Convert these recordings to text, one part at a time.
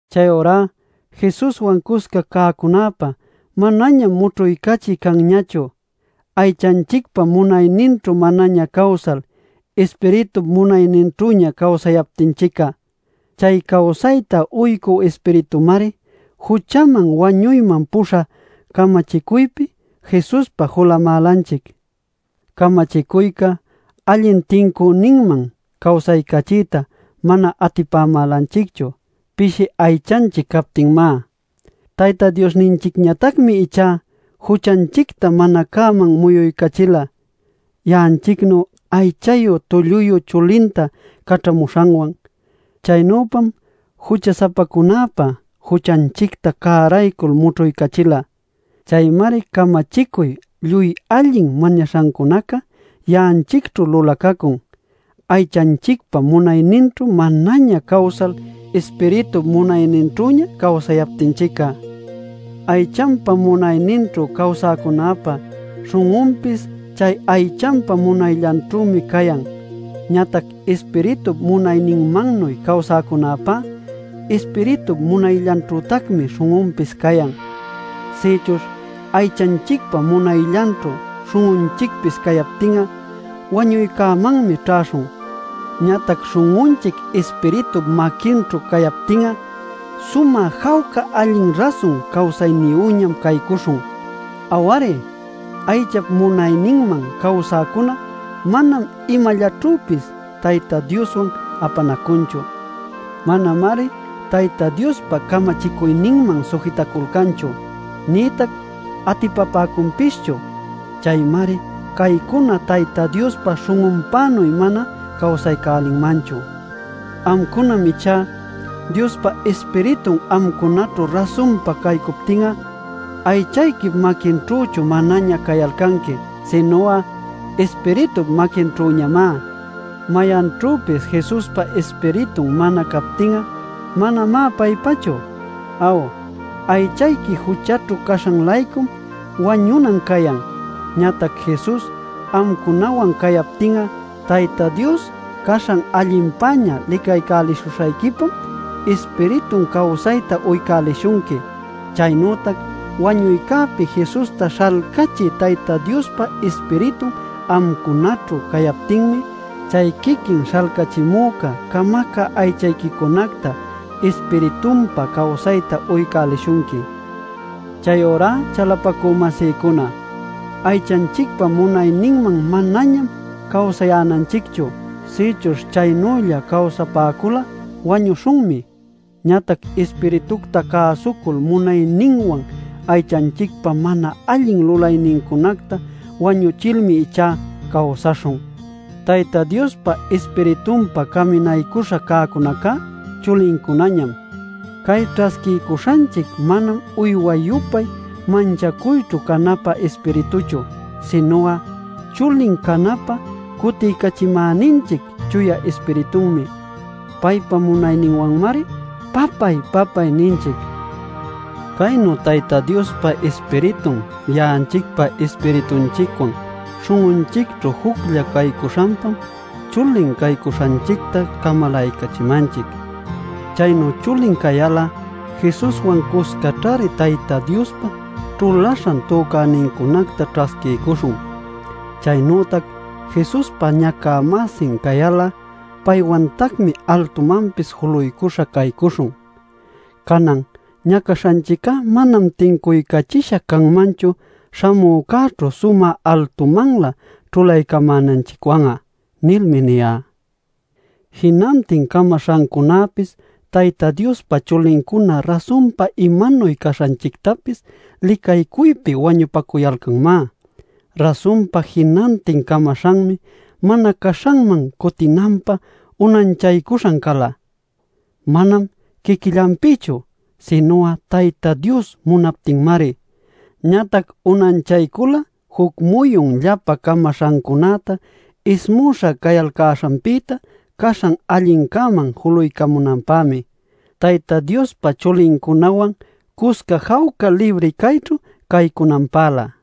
Chayurá Jesuswan cusca cäcunäpä manañam mućhuycachiy canñachu ˻aychanchicpa munayninćhu manaña cawsal, Ispiritup munayninćhüña cawsayaptinchic'a˼. Chay cawsayta uycü Ispiritümari juchaman wañuyman puśhä camachicuypi Jesuspa julamälanchic. Camachicuyca allin tincüninman cawsaycachiyta mana atipamälanchicchu pishi aychanchic captinmá. Tayta Diosninchicñatacmi ichá juchanchicta mana cäman muyuycachila ya'anchicnu aychayu tulluyu chulinta caćhamuśhanwan. Chaynüpam jucha-sapacunäpa juchanchicta cäraycul mućhuycachila. Chaymari camachicuy lluy allin mañaśhancunaca ya'anchicćhu lulacacun aychanchicpa munayninćhu manaña cawsal, Ispiritup munayninćhüña cawsayaptinchic'a. Aychanpa munayninćhu cawsäcunäpa śhun'unpis chay aychanpa munayllanćhümi cayan. Ñatac Ispiritup munayninmannuy cawsäcunäpá Ispiritup munayllanćhütacmi śhun'unpis cayan. Sïchuśh aychanchicpa munayllanćhu śhun'unchicpis cayaptin'a, wañuycämanmi ćhäśhun. Ñatac śhun'unchic Ispiritup maquinćhu cayaptin'a sumä jawca allin rasun cawsayniyüñam caycuśhun. Aw-ari, aychap munayninman cawsäcuna manam imallaćhüpis Tayta Dioswan apanacunchu. Manamari Tayta Diospa camachicuyninman sujitaculcanchu nïtac atipapäcunpischu. Chaymari caycuna Tayta Diospa śhun'unpänuy mana cawsaycälinmanchu. Amcunam ichá, Diospa Ispiritun amcunaćhu rasunpa caycuptin'a, aychayquip maquinćhüchu manaña cayalcanqui, sinu'a Ispiritup maquinćhüñamá. Mayanćhüpis Jesuspa Ispiritun mana captin'a manamá paypachu. Aw, aychayqui juchaćhu caśhan-laycum wañunan cayan. Ñatac Jesus amcunawan cayaptin'a Tayta Dios caśhan allinpäña licaycälishuśhayquipam Ispiritun cawsayta uycälishunqui. Chaynütac wañuycäpi Jesusta śhalcachï Tayta Diospa Ispiritun amcunaćhu cayaptinmi chay quiquin śhalcachimüca camacä aychayquicunacta Ispiritunpa cawsayta uycälishunqui. Chayurá, chalapacü-masïcuna, aychanchicpa munayninman manañam cawsayänanchicchu. Sïchuśh chaynülla cawsapäcul'a wañuśhunmi. Ñatac Ispiritucta cäsucul munayninwan aychanchicpa mana allin lulaynincunacta wañuchilmi ichá cawsaśhun. Tayta Diospa Ispiritunpa caminaycuśha cäcunacá chulincunañam. Cay ćhasquiycuśhanchic manam uyway-yupay manchacuyćhu canapä ispirituchu, sinu'a chulin canapä cutiycachimäninchic Chuya Ispiritunmi. Paypa munayninwanmari: “Papáy papáy” ninchic. Caynu Tayta Diospa Ispiritun ya'anchicpa ispiritunchicwan śhun'unchicćhu juclla caycuśhanpam chulin caycuśhanchicta camalaycachimanchic. Chaynu chulin cayal'a Jesuswan cuscaćhari Tayta Diospa ćhulaśhan tücänincunacta ćhasquiycuśhun. Chaynütac Jesuspa ñacä-masin cayal'a paywantacmi altumanpis juluycuśha caycuśhun. “Canan ñacaśhanchic'a manam tincuycachisha canmanchu śhamücäćhu sumä altumanlä ćhulaycamänanchicwan'a” nilmi niyá. Jinantin camaśhancunäpis Tayta Diospa chulincuna rasun imanuy cananchictapis licaycuypi wañupacuyalcanmá. Rasunpa, jinantin camaśhanmi mana caśhanman cutinanpä unanchaycuśha cala, manam quiquillanpïchu, sinu'a Tayta Dios munaptinmari. Ñatac unanchaycula juc muyun llapan camaśhancunäta ismüśha cayalcäśhanpïta caśhan allincäman juluycunanpämi, Tayta Diospa chulincunawan cusca jawca libri cayćhu caycunanpälä.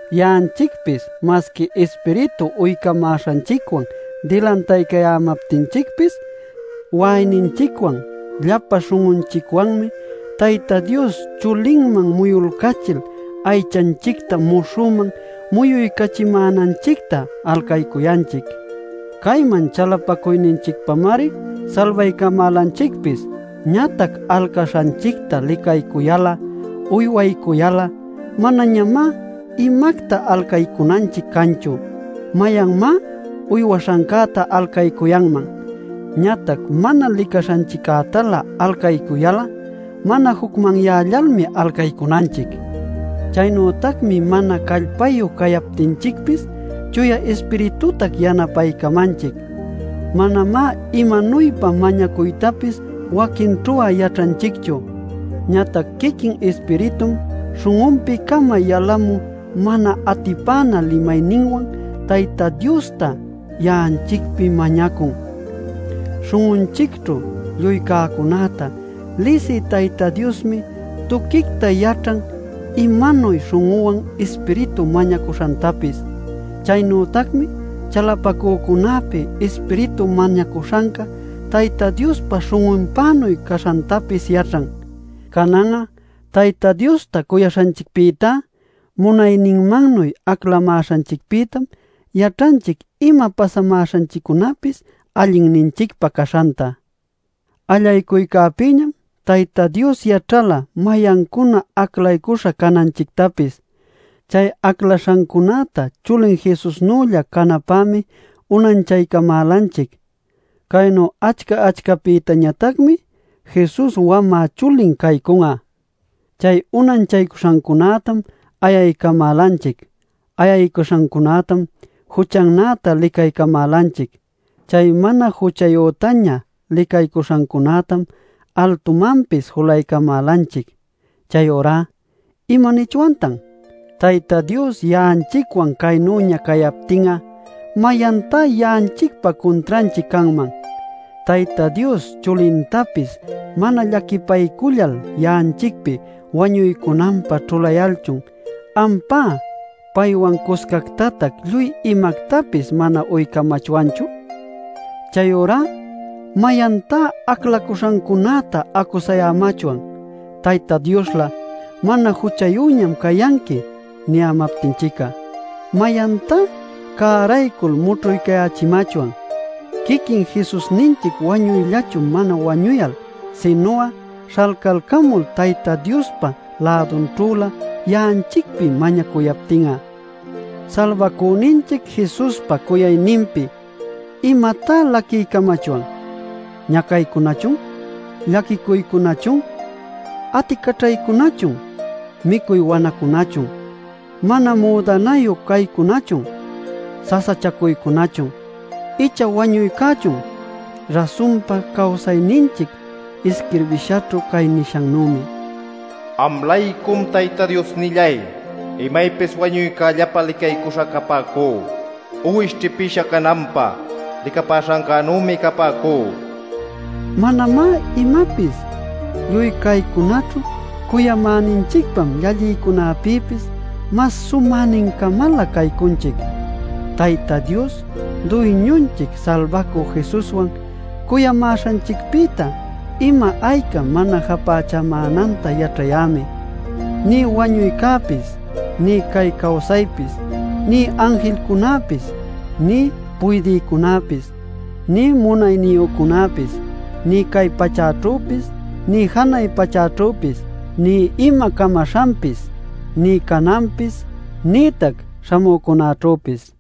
Ya'anchicpis masqui Ispiritu uycamäśhanchicwan dilantaycayämaptinchicpis, wa'ayninchicwan llapan śhun'unchicwanmi Tayta Dios chulinman muyulcachil aychanchicta muśhüman muyuycachimänanchicta alcaycuyanchic. Cayman chalapacuyninchicpamari salbaycamälanchicpis. Ñatac alcaśhanchicta licaycuyal'a uywaycuyal'a manañamá imacta alcaycunanchic canchu. ¿Mayanmá uywaśhancäta alcaycuyanman? Ñatac mana licaśhanchiccätalä alcaycuyal'a mana jucmanyällalmi alcaycunanchic. Chaynütacmi mana callpayu cayaptinchicpis Chuya Ispiritutac yanapaycamanchic. Manamá imanuypa mañacuytapis waquinćhu'a yaćhanchicchu. Ñatac quiquin Ispiritum śhun'unpi-cama yalamü mana atipänä limayninwan Tayta Diosta ya'anchicpi mañacun. Śhun'unchicćhu lluy cäcunäta lisï Tayta Diosmi tuquicta yaćhan imanuy śhun'unwan Ispiritu mañacuśhantapis. Chaynütacmi chalapacücunäpi Ispiritu mañacuśhanca Tayta Diospa śhun'unpänuy caśhantapis yaćhan. Canan'a Tayta Diosta cuyaśhanchicpïtá, munayninmannuy aclamäśhanchicpïtam yaćhanchic ima pasamäśhanchiccunäpis allinninchicpä caśhanta. Allaycuycäpïñam Tayta Dios yaćhala mayancuna aclaycuśhan cananchictapis. Chay aclaśhancunäta chulin Jesusnülla canapämi unanchaycamälanchic. Caynu achca-achcapïtañatacmi Jesus wamä chulin caycun'a. Chay unanchaycuśhancunätam ayaycamälanchic; ayaycuśhancunätam juchannäta licaycamälanchic; chay mana juchayütaña licaycuśhancunätam altumanpis julaycamälanchic. Chayurá ¿imanichwantan? Tayta Dios ya'anchicwan caynüña cayaptin'a, ¿mayantá ya'anchicpa cuntranchic canman? Tayta Dios chulintapis mana llaquipaycullal ya'anchicpi wañuycunanpä ćhulayalchun, ¿ampá paywan cuscactatac lluy imactapis mana uycamachwanchu? Chayurá ¿mayantá aclacuśhancunäta acusaycamachwan Tayta Dioslä “Mana juchayüñam cayanqui” niyämaptinchic'a? ¿Mayantá cäraycul mućhuycachimachwan quiquin Jesusninchic wañuyllachu mana wañuyal, sinu'a śhalcalcamul Tayta Diospa lädunćhülä ya'anchicpi mañacuyaptin'a? Salbacüninchic Jesuspa cuyacuyninpi ¿imatá laquiycamachwan? ¿Ñacaycunachun, llaquicuycunachun, aticaćhaycunachun, micuy wanäcunachun, mana müdanayu caycunachun, sasachacuycunachun, icha wañuycächun? Rasunpa, cawsayninchic isquirbishaćhu cay nishannümi: “Am-laycum, Tayta Diosnilláy, imaypis wañuycällapä licaycuśha capäcú; Uwish ćhipïsha cananpä licapäśhancänümi capäcú” nil. ¡Manamá imapis! Lluy caycunaćhu cuyamäninchicpam llallïcunapïpis mas sumänincamalä caycunchic. ¡Tayta Dios Duyñunchic Salbacü Jesuswan cuyamäśhanchicpïta ima ayca mana japächamänanta yaćhayämi: nï wañuycäpis, nï cay cawsaypis, nï anjilcunäpis, nï puydïcunäpis, nï munayniyücunäpis, nï cay pachäćhüpis, nï janay pachäćhüpis, nï ima camaśhanpis, nï cananpis, nïtac śhamücunäćhüpis!